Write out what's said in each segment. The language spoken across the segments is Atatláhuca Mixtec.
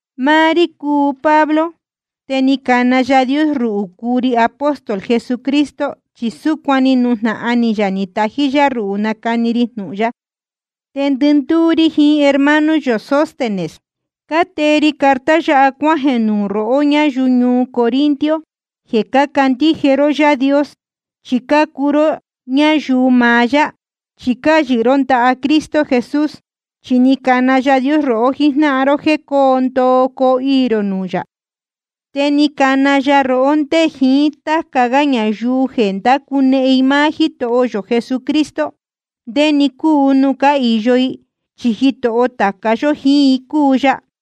Máá rí cúu Pablo, te ni cana Yaā Dios ruhū cúu ri apóstol Jesucristo. Chi súcuan ni nujnahan ni yā ni tají yá ruhū nacani ri jnūhun ya. Te ndɨndúú rí jiín hermano yō Sóstenes cátee ri carta yáha cuájeē nuū rohó ñáyuu ñuu Corinto jeē cácandíje ró Yaā Dios. Chi cácuu ró ñayuu maá yá, chi cáyɨhɨ ró ndaha Cristo Jesús. Chi ni cana Yaā Dios rohó jíjnáhan ró jéē coo ndoo coo iī rō nuū yā. Te ni cana ya rohó ndé jiín táca gá ñayuu jeē ndácunehen i máá Jítoho yō Jesucristo, ndé‑ni cúu nuū cáhīyo i. Chi Jitoho tāca yó jíín i cúu ya.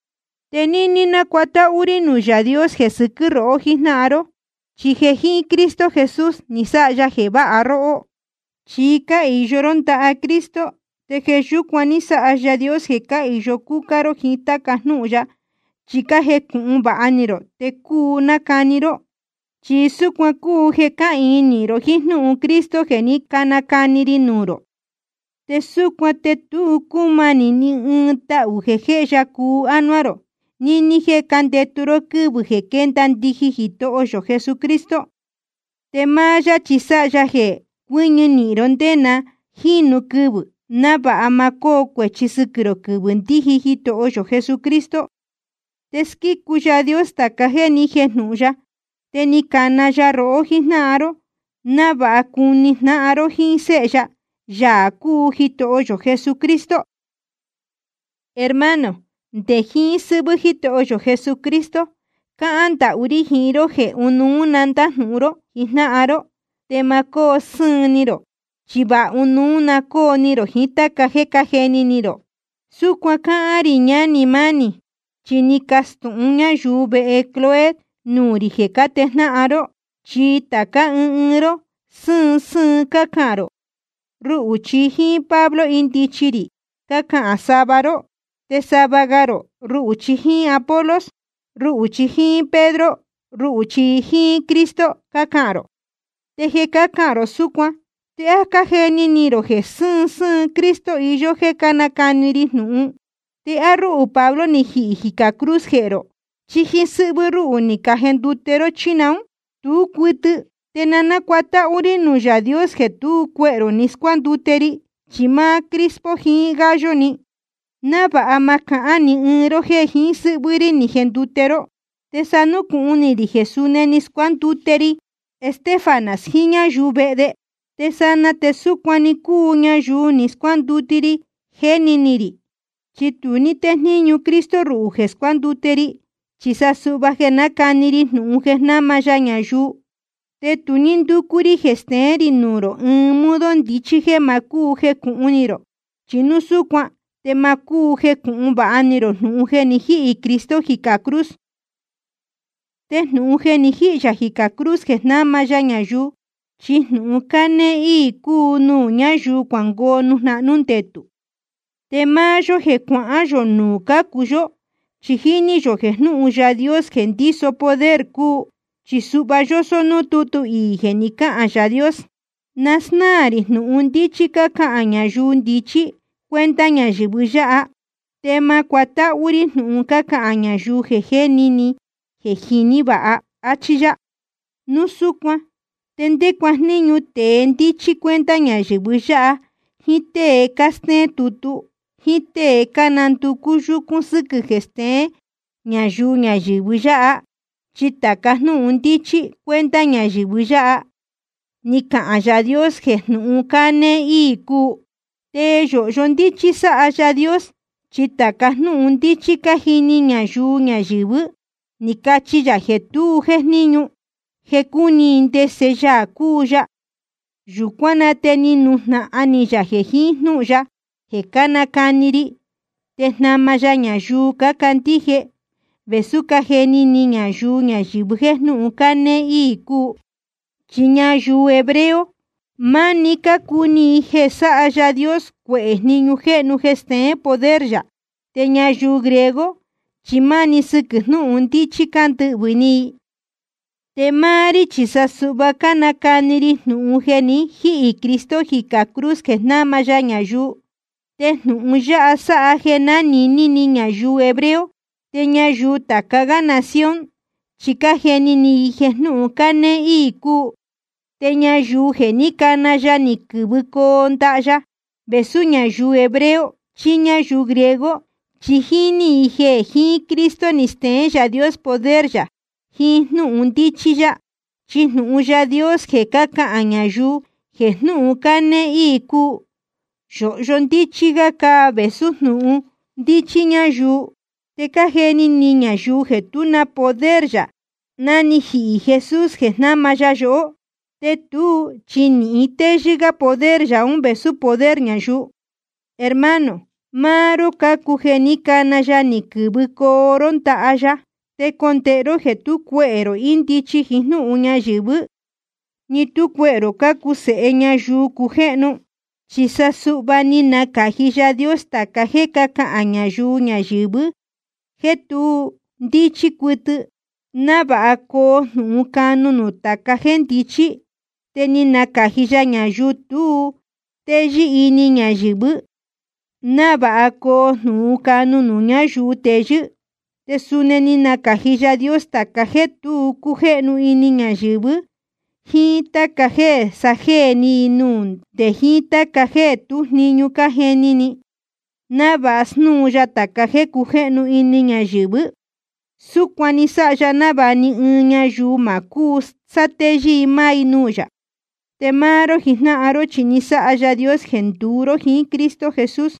Te níní nácuatáhú rí nuū Yaā Dios jeē sɨquɨ́ rohó jijnáhan ró, chi jeē jiín Cristo Jesús ni sáha ya jeē váha róhó. Chi cáyɨhɨ ró ndaha Cristo, te jeē yúcuan ní sáha Yaā Dios jeē cáhīyo cúcá ró jíín táca jnúhun ya, chi cájecūhun vāha ni rō te cúu nácani ró. Chi súcuan cúu jeē cáhīin nīhin ró jíín jnúhun Cristo jeē ní canacani ri nuū rō. Te súcuan te tu cúmanī ni ɨɨn tahū jeē jéhe ya cuu ánuá rō níní jéē cándetu ró quɨ́vɨ̄ jeē quénda ndijin Jitoho yō Jesucristo. Te máá yá chi sáha ya jeē cuɨñɨ nīhin ró nde na jínu quɨvɨ̄, návāha ma cóo cuēchi sɨquɨ̄ rō quɨvɨ̄ ndíji Jitoho yō Jesucristo. Te squícu Yaā Dios tāca jéē ni jéjnūhun ya, te ni cana ya rohó jíjnáhan ró návāha cuni jnáhan ró jíín Séhe ya, Yaā cúu Jitoho yō Jesucristo. Hermano, nde jiín sɨ́hvɨ́ Jítoho yō Jesucristo cahán ndahú rí jiín ró jeē ɨnuú‑ni na ndájnūhun ró jijnáhan ró, te ma cóo sɨ́ɨn ni rō. Chi vāha ɨnuú na cóo ni rō jiín táca jéē cájeni ni rō. Súcuan cáhán rī, ñánī mánī, chi ni cacastūhun ñáyuu vehe Cloé nuū rī jeē cátejnáhan ró. Chi tācá ɨɨn ɨɨn ró sɨ́ɨn sɨ́ɨn cácahān rō: Ruhū chi jíín Pablo índichi rī, cácahān sava ró. Te sava ga rō: Ruhū chi jíín Apolos. Ruhū chi jíín Pedro. Ruhū chi jíín Cristo. Cácahān rō. Te jeē cácahān rō súcuan ¿te á cájeni ni rō jeē sɨ́ɨn sɨ́ɨn Cristo iyó jéē cánacani ri jnūhun? ¿Te á rúhū Pablo ni jihī jicā cruz jehē rō? ¿Chí jíín sɨ́hvɨ́ rúhū ni cajendute ró, chí naún? Tú cuɨtɨ. Te na cútahū rī nuū Yaā Dios jeē tú cuehē rō ni scuándute ri, chi máá Crispo jiín Gayo‑ni, návāha ma cahán ni ɨɨn ró jéē jiín sɨ́hvɨ́ rí ni jendute ró. Te sá núcūhun ni rī jeē suni ni scuándute ri Estéfanas jiín ñáyuu vehe de. Te sanaa te súcuan‑ni cúu ñayuu ni scuándute ri, jéni ni rī. Chi tu ní téjníñu Cristo ruhū jeē scuándute ri, chi sa suhva jeē nácani ri jnūhun jeē jnáma ya ñayuu. Te tu ní ndúcú rí jeē steén rī nuū rō ɨɨn modo ndichí jéē ma jécūhun ni rō, chi núu súcuan te ma cúu jecūhun vāha ni rō jnūhun jeē ni jíhī Cristo jicā cruz. Te jnūhun jeē ni jíhī yā jicā cruz jeē jnáma ya ñayuu, chi jnūhun cánéé íī cúu nuū ñáyuu cuangoo nuū jnahnú ndetū. Te máá yó jeē cuahán yō nuū cácu yó, chi jíní yō jeē jnūhun Yaā Dios jeē ndíso poder cúu. Chi suhva yósó núū tútu iī jeē ni cáhān Yaā Dios: Na snáā rī jnūhun ndíchí cácahān ñayuu ndichí cuenta ñayɨ̄vɨ yáha, te ma cuátáhú rí jnūhun cácahān ñayuu jeē jéni ni jeē jiní vāha. Achí yá. Núu súcuan ¿te ndé cuajníñu tēe ndíchí cuenta ñayɨ̄vɨ yáha, jíín tée cástéén tutu, jíín tée cánanducú yúcún sɨ́quɨ̄ jeē steén ñayuu ñayɨ̄vɨ yáha? Chi tāca jnúhun ndíchí cuenta ñayɨ̄vɨ yáha, ni cahān Yaā Dios jeē jnúhun cánéé íī cúu. Te yōhyo ndíchí sáha Yaā Dios. Chi tāca jnúhun ndíchí cájini ñayuu ñayɨ̄vɨ́, ni cachi ya jeē tu jéjníñu jeē cúni i ndese Yaā cúu ya. Yūcuán na te ni nujnahan ni yā jeē jiín jnúhun ya jeē cánacani ri te jnama ya ñayuu cácandíje, vēsú cájeni ni ñayuu ñayɨ̄vɨ jéē jnúhun cánéé íī cúu. Chi ñayuu hebreo, máni cácuni i jeē sáha Yaā Dios cuehē jniñu jéhnu jeē steén poder yā. Te ñayuu griego chi máni sɨquɨ̄ jnūhun ndíchí cándɨhvɨ̄ ni i. Te máá rí chi sa suhva cánacani ri jnūhun jeē ni jíhī Cristo jicā cruz jeē jnáma ya ñayuu. Te jnūhun yáha sáha jeē jnánīní ni ñayuu hebreo, te ñayuu tāca gá nación chi cájeni ni i jeē jnúhun cánéé íī cúu. Te ñayuu jeē ní cana ya ni quɨ̄vɨcoo ndaha ya, vēsú ñayuu hebreo chí ñáyuu griego, chi jíní i jeē jiín Cristo ni steén Yaā Dios poder yā jiín jnúhun ndíchí yá. Chi jnūhun Yaā Dios jeē cácahān ñayuu jeē jnúhun cánéé íī cúu, yōhyo ndíchí gá vēsú jnūhun ndíchí ñáyuu. Te cájeni ni ñayuu jeē tú na poder yā ná ni jihī Jesús jeē jnáma ya yohó, te tuú chi nīhin téyɨ́ gá poder yā ún vēsú poder ñayuu. Hermano, máá ró cácuu jeē ní cana ya ni quɨ̄vɨcoo ró ndaha ya. Te condēhe ró jeē tú cuehē rō ndichí jíín jnúhun ñayɨ̄vɨ́, ni tú cuehē rō cándacu jniñu, ni tú cuehē rō cácuu sēhe ñayuu cujéhnu. Chi sa suhva ni nacāji Yaā Dios tāca jéē cácahān ñayuu ñayɨ̄vɨ jéē tu ndíchí cuɨtɨ, návāha coo jnūhun canu nuū tāca jéē ndichí. Te ni nacāji ya ñayuu tu téyɨ́ ini ñayɨ̄vɨ́, návāha coo jnūhun canu nuū ñayuu teyɨ́. Te suni ni nacāji Yaā Dios tāca jéē tu cújéhnu ini ñayɨ̄vɨ́, jíín táca jéē sajéē ni i nuū, nde jiín táca jéē tú jniñu cájeni ni i, návāha snúu ya tāca jéē cujéhnu ini ñayɨ̄vɨ́. Súcuan ni sáha ya návāha ni ɨɨn ñayuu ma cúu sátéyɨ́ i máá i nuū yā. Te máá ró jijnáhan ró chi ni sáha Yaā Dios jeē nduú ró jiín Cristo Jesús.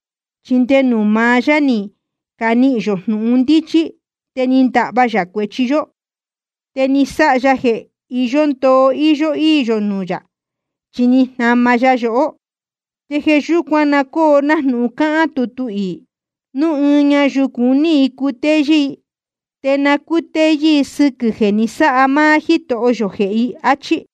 Chi nde nuū maá yá ni canihīn yō jnūhun ndíchí, te ni ndahva yā cuēchi yó, te ni sáha ya jeē iyó ndoo íyó íī yō nuū yā, chi ni jnama ya yohó. Te jeē yúcuan na cóo nájnūhun cáhán tutu iī: Núu ɨɨn ñayuu cuní i cutéyɨ́ i, te na cútéyɨ́ i sɨquɨ̄ jeē ni sáha máá Jítoho yō jehē i, áchí.